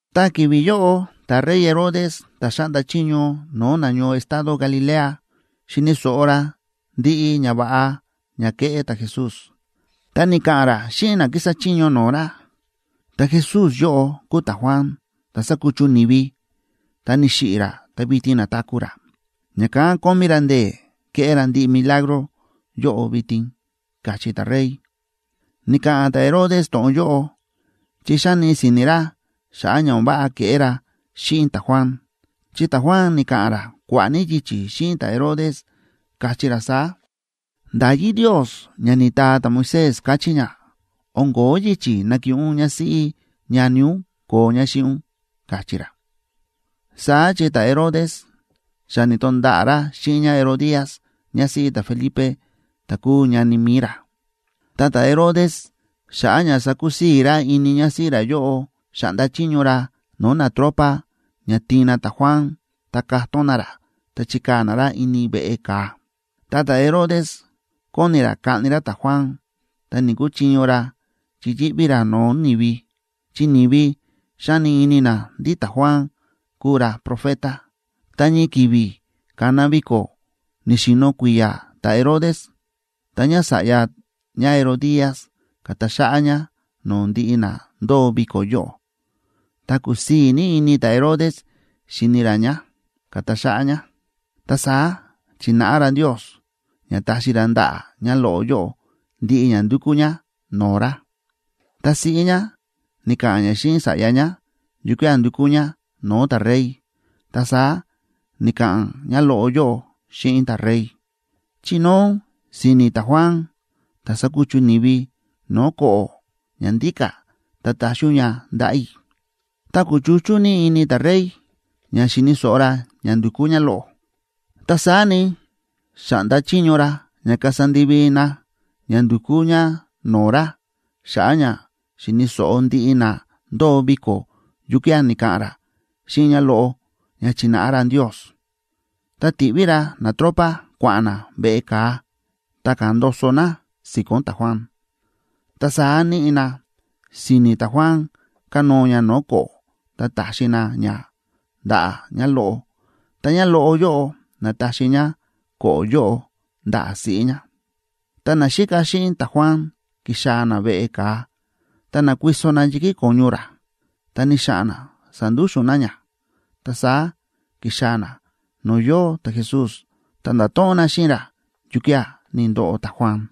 Ta ki̱vi̱ yóꞌo ta̱rey Herodes, ta̱ xáꞌnda chiño no̱o̱ nañoo estado Galilea, xi̱ni̱ so̱ꞌo ra ndiꞌi ñava̱ꞌa ña ke̱ꞌé ta̱Jesús, ta ni̱ka̱ꞌa̱n ra xíꞌin na kísa chiño no̱o̱ ra: ―Ta̱Jesús yóꞌo kúu ta̱Juan, ta̱ sa̱kuchu ni̱vi, ta ni̱xiꞌi̱ ra ta vitin na̱taku̱ ra, ña̱kán kómí ra ndee̱ kéꞌé ra ndiꞌi milagro yóꞌo vitin ―káchí ta̱rey. Ni̱ka̱ꞌa̱n ta̱Herodes to̱ꞌon yóꞌo chi xáni si̱ni̱ ra xa̱ꞌa̱ ña o̱n váꞌa ke̱ꞌé ra xíꞌin ta̱Juan. Chi ta̱Juan ni̱ka̱ꞌa̱n ra kua̱ꞌa̱ ní yichi̱ xíꞌin ta̱Herodes, káchí ra saá: ―Nda̱yí Ndios ña ni̱taa ta̱Moisés káchí ña, o̱n ko̱ó yichi̱ nakiꞌin ún ñásíꞌí ñani ún koo ñá xíꞌin ún ―káchí ra. Saá chi ta̱Herodes xa ni̱to̱nda̱ꞌa̱ ra xíꞌin ñáHerodías ñásíꞌí ta̱Felipe ta̱ kúu ñani mi̱i ra. Ta ta̱Herodes, xa̱ꞌa̱ ña sakusii̱ ra ini ñásíꞌí ra yóꞌo, xa̱ꞌnda chiño ra no̱o̱ natropa ña tiin na ta̱Juan, ta ka̱tón na ra ta chi̱kaa̱ na ra ini veꞌe ka̱a. Ta ta̱Herodes kóni ra kaꞌni ra ta̱Juan, ta ni̱‑kuchiño ra chi yíꞌví ra no̱o̱ ni̱vi, chi ni̱vi xáni ini na ndí ta̱Juan kúu ra profeta. Ta ñii ki̱vi̱ ka̱na viko̱ ni̱xi̱no̱ kui̱ya̱ ta̱Herodes, ta ñása̱ꞌya ñáHerodías ka̱ta xáꞌá ñá no̱o̱ ndiꞌi na ndóo viko̱ yóꞌo, ta kúsii̱ ní ini ta̱Herodes xíni ra ñá, ka̱ta xáꞌá ñá. Ta saá chi̱náꞌa ra Ndios ña taxi ra ndaꞌa̱ ñáloꞌo yóꞌo ndiꞌi ña ndukú ñá no̱o̱ ra. Ta siꞌí ñá ni̱ka̱ꞌa̱n ñá xíꞌin sa̱ꞌya ñá yukía̱ ndukú ñá no̱o̱ ta̱rey, ta saá ni̱ka̱ꞌa̱n ñáloꞌo yóꞌo xíꞌin ta̱rey: ―Chinóo ún si̱ni̱ ta̱Juan, ta̱ sa̱kuchu ni̱vi, no̱o̱ ko̱ꞌo̱ ña ndíka̱, ta taxi ún ña ndaꞌa̱ i̱. Ta kúchuchú ní ini ta̱rey ña xi̱ni̱ so̱ꞌo ra ña ndu̱kú ñáloꞌo, ta saá ni, xa̱ꞌnda chiño ra ña kasa ndivi na ña ndukú ñá no̱o̱ ra, xa̱ꞌa̱ ña xi̱ni̱ so̱ꞌo ndiꞌi na ndóo viko̱ yukía̱ ni̱ka̱ꞌa̱n ra xíꞌin ñáloꞌo ña chi̱náꞌa ra Ndios. Ta ti̱ꞌví ra natropa kua̱ꞌa̱n na veꞌe ka̱a, ta ka̱ndoso na si̱ko̱n ta̱Juan. Ta saá níꞌi na si̱ni̱ ta̱Juan kánóo ña no̱o̱ ko̱ꞌo̱ ta ta̱xi na ña ndaꞌa̱ ñáloꞌo, ta ñáloꞌo yóꞌo na̱taxi ñá ko̱ꞌo̱ yóꞌo ndaꞌa̱ siꞌí ñá. Ta naxíka xíꞌin ta̱Juan ki̱xaa̱ na veꞌe ka̱a, ta na̱kuiso na yi̱kí ko̱ñu ra, ta ni̱xa̱ꞌa̱n na sa̱ndúxu̱n na ña. Ta saá ki̱xaa̱ na no̱o̱ yóo ta̱Jesús, ta nda̱to̱ꞌon na xíꞌin ra yukía̱ ni̱ndoꞌo ta̱Juan.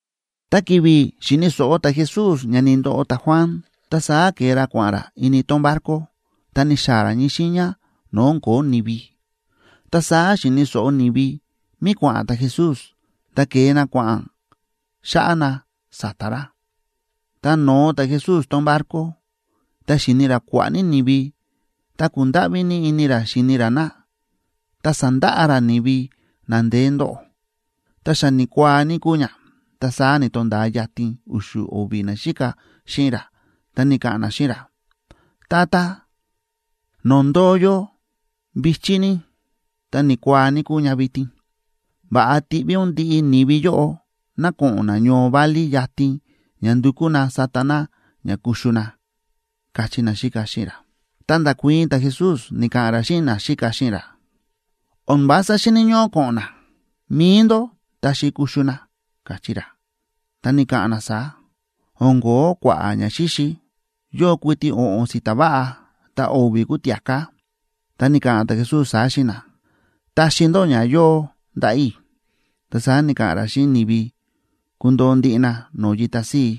Ta ki̱vi̱ xi̱ni̱ so̱ꞌo ta̱Jesús ña ni̱ndoꞌo ta̱Juan, ta saá ke̱e ra kua̱ꞌa̱n ra ini tón barco, ta ni̱xaa̱ ra ñii xiiña no̱o̱ o̱n ko̱ó ni̱vi. Ta saá xi̱ni̱ so̱ꞌo ni̱vi mí kua̱ꞌa̱n ta̱Jesús, ta ke̱e na kua̱ꞌa̱n xáꞌá na sa̱ta̱ ra. Tá no̱o ta̱Jesús tón barco, ta xi̱ni ra kua̱ꞌa̱ ní ni̱vi, ta kúndáꞌví ní ini ra xíni ra na, ta sa̱ndaꞌa ra ni̱vi na ndeé ndóꞌo. Ta xa ni̱kuaa ní kúu ña, ta saá ni̱to̱nda̱a yatin u̱xu̱ o̱vi̱ naxíka xíꞌin ra, ta ni̱ka̱ꞌa̱n na xíꞌin ra: ―Tata, no̱o̱ ndóo yó vi̱chí ní, ta ni̱kuaa ní kúu ña vitin. Va̱ꞌa tiꞌví ún ndiꞌi ni̱vi yóꞌo ná ko̱ꞌo̱n na ñoo válí yatin ña ndukú na sata na ña kuxu na ―káchí naxíka xíꞌin ra. Ta nda̱kuii̱n ta̱Jesús, ni̱ka̱ꞌa̱n ra xíꞌin naxíka xíꞌin ra: ―O̱n vása xíni̱ ñóꞌó ko̱ꞌo̱n na. Mi̱i ndó taxi kuxu na ―káchí ra. Ta ni̱ka̱ꞌa̱n na saá: ―O̱n ko̱ó kua̱ꞌa̱ ñaxíxi. Yóo kuiti o̱ꞌo̱n si̱ta̱ váꞌa ta o̱vi̱ kúu tia̱ká. Ta ni̱ka̱ꞌa̱n ta̱Jesús saá xíꞌin na: ―Taxi ndó ña yóo ndaꞌa̱ i̱. Ta saá ni̱ka̱ꞌa̱n ra xíꞌin ni̱vi kundoo ndiꞌi na no̱o̱ yita síi.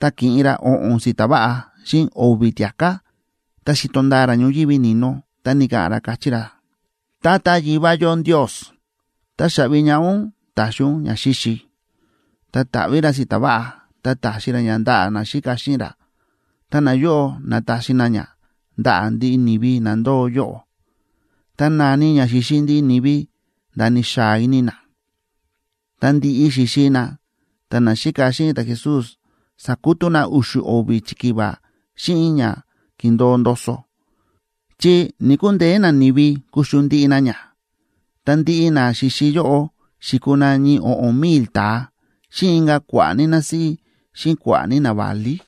Ta ki̱ꞌin ra o̱ꞌo̱n si̱ta̱ váꞌa xíꞌin o̱vi̱ tia̱ká, ta xi̱to ndaa ra ñoyívi ni̱no, ta ni̱ka̱ꞌa̱n ra, káchí ra: ―Tata Yivá yó Ndios, táxaꞌvi ñaꞌá ún ta̱xi ún ñaxíxi. Ta ta̱ꞌví ra si̱ta̱ váꞌa, ta ta̱xi ra ña ndaꞌa̱ naxíka xíꞌin ra, ta nayóꞌo na̱taxi na ña ndaꞌa̱ ndiꞌi ni̱vi na ndóo yóꞌo. Ta na̱ni ña xi̱xi ndiꞌi ni̱vi nda̱ ni̱xaa ini na. Tá ndi̱ꞌi xi̱xi na, ta naxíka xíꞌin ta̱Jesús sa̱kutú na u̱xu̱ o̱vi̱ chikiva xíꞌin ña ki̱ndo̱o ndoso, chi ni̱‑kundeé nani̱vi kuxu ndiꞌi na ña. Ta ndiꞌi na xi̱xi yóꞌo xi̱kuu na ñii o̱ꞌo̱n mil ta̱a, xíꞌin inka̱ kua̱ꞌa̱ ní násíꞌí xíꞌin kua̱ꞌa̱ ní naválí.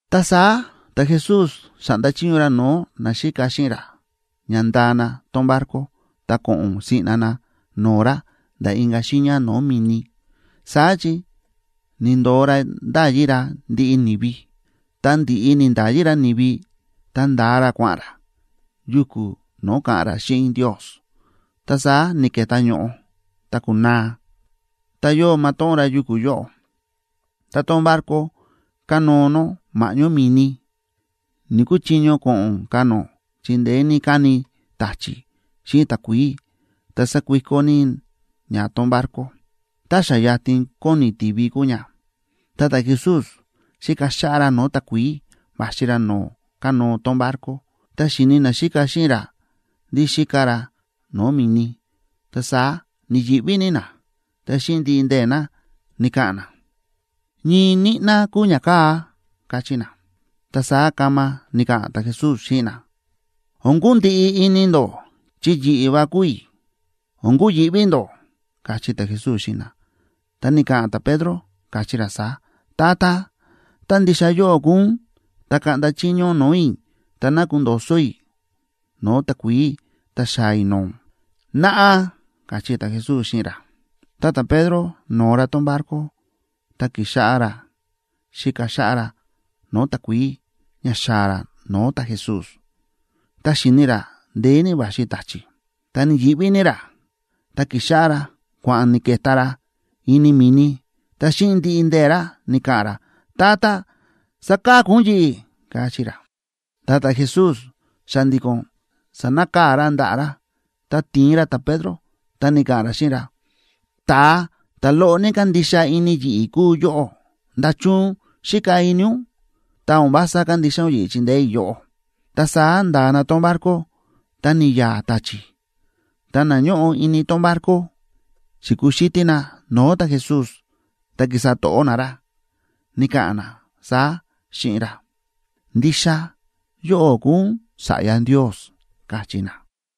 Ta saá ta̱Jesús xa̱ꞌnda chiño ra no̱o̱ naxíka xíꞌin ra ña ndaa na tón barco ta ko̱ꞌo̱n siꞌna na no̱o̱ ra nda̱ inka̱ xiiña no̱o̱ mi̱ni, saá chi ni̱ndo̱o ra nda̱yi ra ndiꞌi ni̱vi. Tá ndi̱ꞌi ni̱nda̱yi ra ni̱vi, ta nda̱a ra kua̱ꞌa̱n ra yuku̱ no̱o̱ ka̱ꞌa̱n ra xíꞌin Ndios. Ta saá ni̱ke̱tá ño̱ꞌo ta ku̱naa, ta yóo matóꞌón ra yuku̱ yóꞌo, ta tón barco kánóo nó ma̱ꞌñó mi̱ni. Ni̱‑kuchiño ko̱ꞌo̱n ka̱ nó chi ndeé ní káni ta̱chi̱ xíꞌin takuií ta sákuiko ní ña tón barco. Ta xa yatin kóni tivi kúu ña,a ta ta̱Jesús xíka xáꞌá ra no̱o̱ takuií va̱xi ra no̱o̱ kánóo tón barco. Tá xi̱ni naxíka xíꞌin ra ndí xíka ra no̱o̱ mi̱ni, ta saá ni̱yi̱ꞌví ní na, ta xíꞌin ndiꞌi ndee̱ na ni̱ka̱ꞌa̱n na: ―¡Ñii ñíꞌná kúu ñakaa̱! ―káchí na. Ta saá kama ni̱ka̱ꞌa̱n ta̱Jesús xíꞌin na: ―O̱n kundiꞌi ini ndó, chi yi̱ꞌi̱ va kúu i̱. O̱n kuyi̱ꞌví ndó ―káchí ta̱Jesús xíꞌin na. Ta ni̱ka̱ꞌa̱n ta̱Pedro, káchí ra saá: ―Tata, tá ndixa yóꞌó kúu ún, ta kaꞌnda chiño ún no̱o̱ i̱ ta ná kundo̱so̱ i̱ no̱o̱ takuií ta xaa̱ i̱ no̱o̱ ún. ―Naꞌa ―káchí ta̱Jesús xíꞌin ra. Ta ta̱Pedro no̱o ra tón barco, ta ki̱xáꞌá ra xíka xáꞌá ra no̱o̱ takuií ña xaa̱ ra no̱o̱ ta̱Jesús. Ta xi̱ni ra ndeé ní va̱xi ta̱chi̱, ta ni̱yi̱ꞌví ní ra, ta ki̱xáꞌá ra kua̱ꞌa̱n ni̱ke̱tá ra ini mi̱ni, ta xíꞌin ndiꞌi ndee̱ ra ni̱ka̱ꞌa̱n ra: ―Tata, ¡saka̱ku ún yi̱ꞌi̱! ―káchí ra. Ta ta̱Jesús xa̱ndi̱ko̱n sa̱nakaa̱ ra ndaꞌa̱ ra, ta ti̱in ra ta̱Pedro, ta ni̱ka̱ꞌa̱n ra xíꞌin ra: ―¡Ta̱a ta̱ loꞌo ní kándixa ini yi̱ꞌi̱ kúu yóꞌó! ¿Nda̱chun xíka ini ún, ta o̱n vása kándixa ún yi̱ꞌi̱ chindeé i̱ yóꞌó? Ta saá nda̱a na tón barco, ta ni̱ya̱a̱ ta̱chi̱. Ta na ñóꞌo ini tón barco xi̱kuxítí na no̱o̱ ta̱Jesús, ta ki̱sa to̱ꞌó na ra, ni̱ka̱ꞌa̱n na saá xíꞌin ra: ―¡Ndixa yóꞌó kúu ún Sa̱ꞌya Ndios! ―káchí na.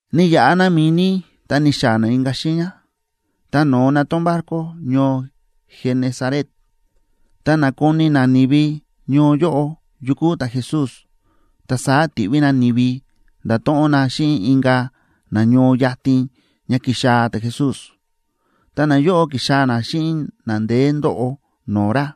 Ni̱yaꞌa na mi̱ni ta ni̱xaa̱ na inka̱ xiiña, ta no̱o na tón barco ñoo Genesaret. Ta na̱koni nani̱vi ñoo yóꞌo yu kúu ta̱Jesús, ta saá ti̱ꞌví na ni̱vi ndato̱ꞌon na xíꞌin inka̱ na ñoo yatin ña ki̱xaa̱ ta̱Jesús. Ta nayóꞌo ki̱xaa̱ na xíꞌin na ndeé ndóꞌo no̱o̱ ra.